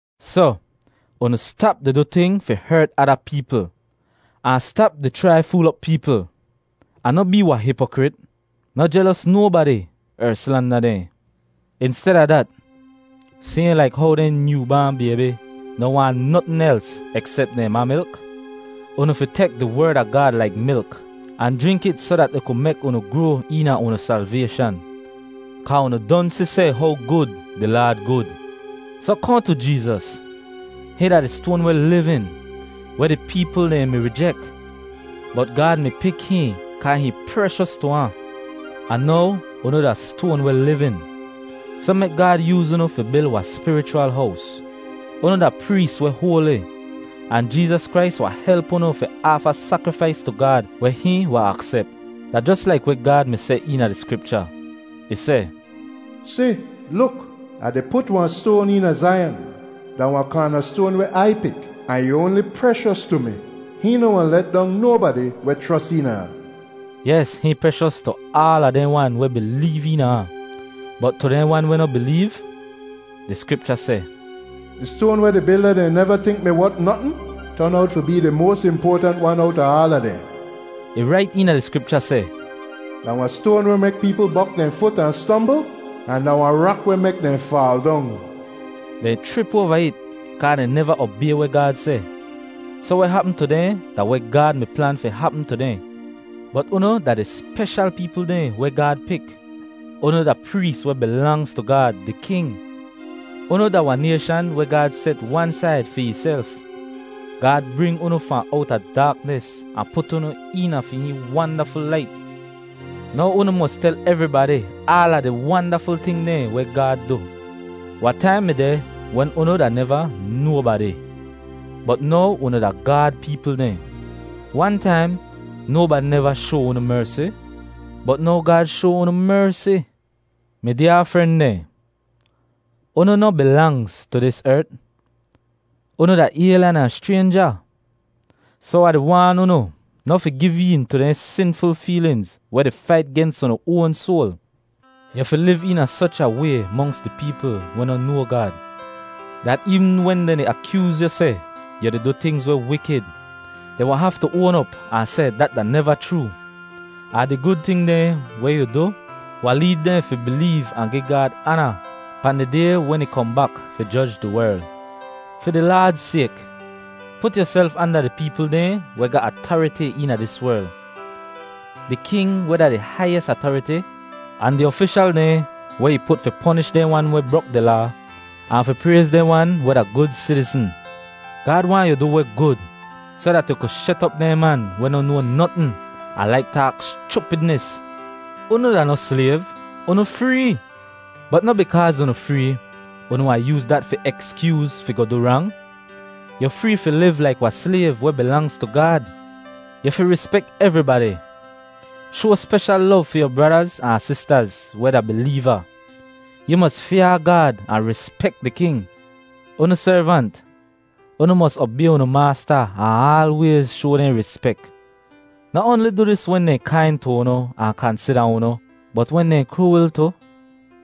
Soh, unu stap di du ting fi hert ada peepl, ahn stap di chrai fool op peepl, ahn noh bee wahn hipokrit. Noh jelos nobadi, er slanda dehn. Insteda dat, sayhn laik how dehn nyoo baan baybi noh waahn notn els eksep dehn ma milk, unu fi tek di Werd a Gaad laik milk ahn jrink it soh dat ih ku mek unu groa eena unu salvayshan, kaa unu don si seh how gud di Laad gud. Soh kohn tu Jeezas. Hihn da di Stoan weh livin, weh di peepl dehn mi rijek, bot Gaad mi pik hihn kaa hihn preshos tu ahn. Ahn now unu da stoan weh livin, soh mek Gaad yooz unu fi bil wahn spirichwal hows. Unu da prees weh hoali, ahn Jeezas Krais wahn help unu fi aafa sakrifais tu Gaad weh hihn wahn aksep. Da jos laik weh Gaad mi seh eena di Skripcha. Ih seh, “Si, luk, Ah di put wahn stoan eena Zaiyan. Da wahn kaanastoan weh Ai pik, ahn ih oanli preshos tu mi. Hihn noh wahn let dong nobadi weh chros eena ahn.” Yes, hihn preshos tu aala dehn wan weh bileev eena ahn; bot tu dehn wan weh noh bileev, di Skripcha seh, “Di stoan weh di bilda dehn neva tink mi wot notn, ton owt fi bee di moas impoatant wan owta aala dehn.” Ih rait eena di Skripcha seh, “Da wahn stoan weh mek peepl bok dehn fut ahn stombl, ahn da wahn rak weh mek dehn faal dong.” Dehn chrip oava it kaa dehn neva obay weh Gaad seh. Soh weh hapm tu dehn da weh Gaad mi plan fi hapm tu dehn. Bot unu da di speshal peepl dehn weh Gaad pik. Unu da prees weh bilangz tu Gaad, di king. Unu da wahn nayshan weh Gaad set wan said fi ihself. Gaad bring unu fahn owta daaknis ahn put unu eena fi hihn wandaful lait. Now unu mos tel evribadi aala di wandaful ting dehn weh Gaad du. Wahn taim mi deh wen unu da neva nobadi, bot now unu da Gaad peepl dehn. Wan taim, nobadi neva shoa unu mersi, bot now Gaad shoa unu mersi. Mi dyaa fren dehn, unu noh bilangz tu dis ert; unu da aylyan ahn schraynja. Soh Ah di waan unu noh fi giv een tu dehn sinful feelinz weh di fait gens unu oan soal. Yu fi liv eena soch a way monks di peepl weh noh noa Gaad, dat eevn wen dehn di akyooz yu seh yu di du tingz weh wikid, dehn wahn haftu oan op ahn seh dat da neva chroo, ahn di gud ting dehn weh yu du wahn leed dehn fi bileev ahn gi Gaad aana pahn di Day wen ih kohn bak fi joj di werl. Fi di Laad sayk, put yuself anda di peepl dehn weh ga atariti eena dis werl: di king, weh da di haiyis atariti, ahn di ofishal dehn, weh ih put fi ponish dehn wan weh brok di laa ahn fi prayz dehn wan weh da gud sitizn. Gaad waahn yu du weh gud soh dat yu ku shet op dehn man weh no noa notn ahn laik taak schupidnis. Unu da noh slayv; unu free. Bot noh bikaaz unu free unu wahn yooz dat fi ekskyooz fi goh du rang. Yu free fi liv laik wahn slayv weh bilangz tu Gaad. Yu fi rispek evribadi. Shoa speshal lov fi yu bradaz ahn sistaz weh da bileeva. Yu mos fyaa Gaad ahn rispek di King. Unu servant, unu mos obay unu maasta ahn aalwayz shoa dehn rispek. Noh oanli du dis wen dehn kain tu unu ahn kansida unu, bot wen dehn kruwil tu.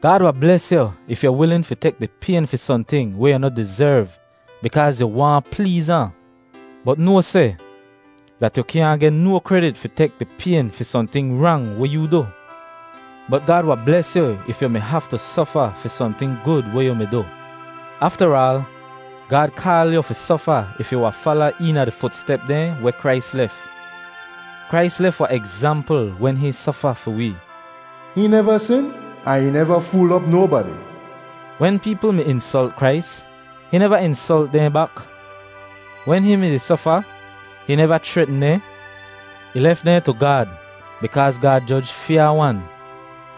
Gaad wahn bles yu if yu wilin fi tek di payn fi sohnting weh yu noh dizerv bikaaz yu waahn pleez ahn. Bot noa seh dat yu kyaahn geh no kredit fi tek di payn fi sohnting rang weh yoo du. Bot Gaad wahn bles yu if yu mi haftu sofa fi sohnting gud weh yu mi du. Aftaraal, Gaad kaal yu fi sofa if yu wahn fala eena di futstep dehn weh Krais lef. Krais lef wahn egzampl wen hihn sofa fi wee. “Hihn neva sin, ahn ih neva fool op nobadi.” Wen peepl mi insolt Krais, hihn neva insolt dehn bak. Wen hihn mi-di sofa, hihn neva chretn dehn. Ih lef dehn tu Gaad bikaaz Gaad joj fyaa-wan.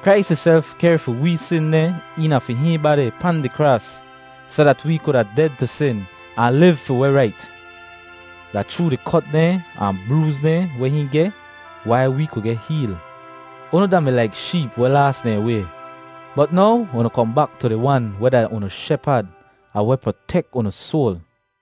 Krais ihself kehr fi wee sin dehn eena fi hihn badi pahn di kraas soh dat wee kuda ded tu sin ahn liv fi weh rait. Da chroo di kot dehn ahn brooz dehn weh hihn geh wai wee ku geh heel. Unu da-mi laik sheep weh laas dehn way, bot now unu kohn bak tu di Wan weh da unu Shepad ahn weh protek unu soal.